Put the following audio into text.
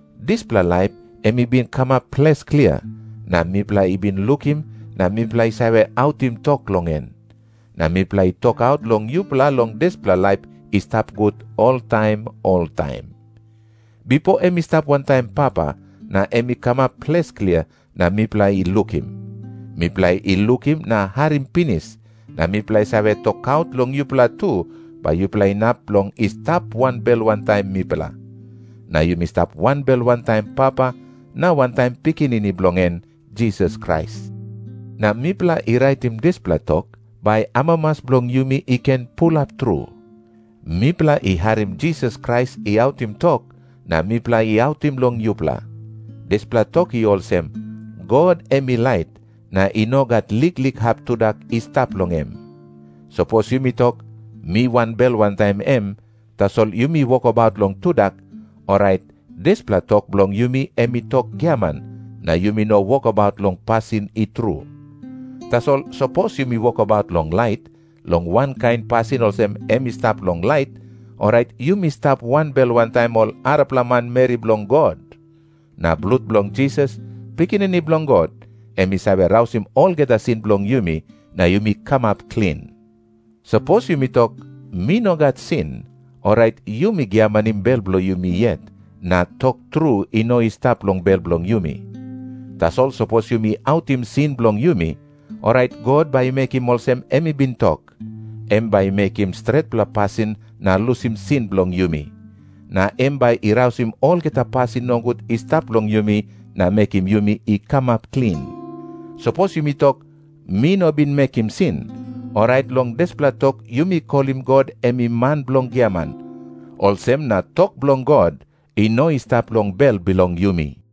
Dispela laip em i bin kamap ples klia, na mipela i bin lukim, na mipela i save autim tok long en. Na mipela i tokaut long yupela long dispela laip i stap gut oltaim oltaim. Bipo em i stap wantaim Papa, na em i kamap ples klia na mipela i lukim. Mipela i lukim na harim pinis, na mipela i save tokaut long yupela tu, bai yupela inap long i stap wanbel wantaim mipela. Na yumi stap wanbel wantaim Papa, na wantaim Pikinini bilong en Jisas Krais. Na mipela i raitim dispela tok, bai amamas bilong yumi i ken pulap tru. Mipela i harim Jisas Krais i autim tok, na mipela i autim long yupela. Dispela tok i olsem, God em i lait, na i no gat liklik hap tudak i stap long em. Sapos yumi tok, "Mi wanbel wantaim em," tasol yumi wokabaut long tudak, orait dispela tok bilong yumi em i tok giaman, na yumi no wokabaut long pasin i tru. Tasol sapos yumi wokabaut long lait, long wankain pasin olsem em i stap long lait, orait yumi stap wanbel wantaim ol arapela manmeri bilong God. Na blut bilong Jisas, Pikinini Bilong God, em i save rausim olgeta sin bilong yumi na yumi kamap klin. Sapos yumi tok, "Mi no gat sin," orait yumi giamanim bel bilong yumi yet, na tok tru i no i stap long bel bilong yumi. Tasol sapos yumi autim sin bilong yumi, orait God bai i mekim olsem em i bin tok. Em bai i mekim stretpela pasin na lusim sin bilong yumi. Na em bai i rausim olgeta pasin nogut i stap long yumi na mekim yumi i kamap klin. Sapos yumi tok, "Mi no bin mekim sin," orait long dispela tok yumi kolim God em i man bilong giaman. Olsem na tok bilong God i no i stap long bel bilong yumi.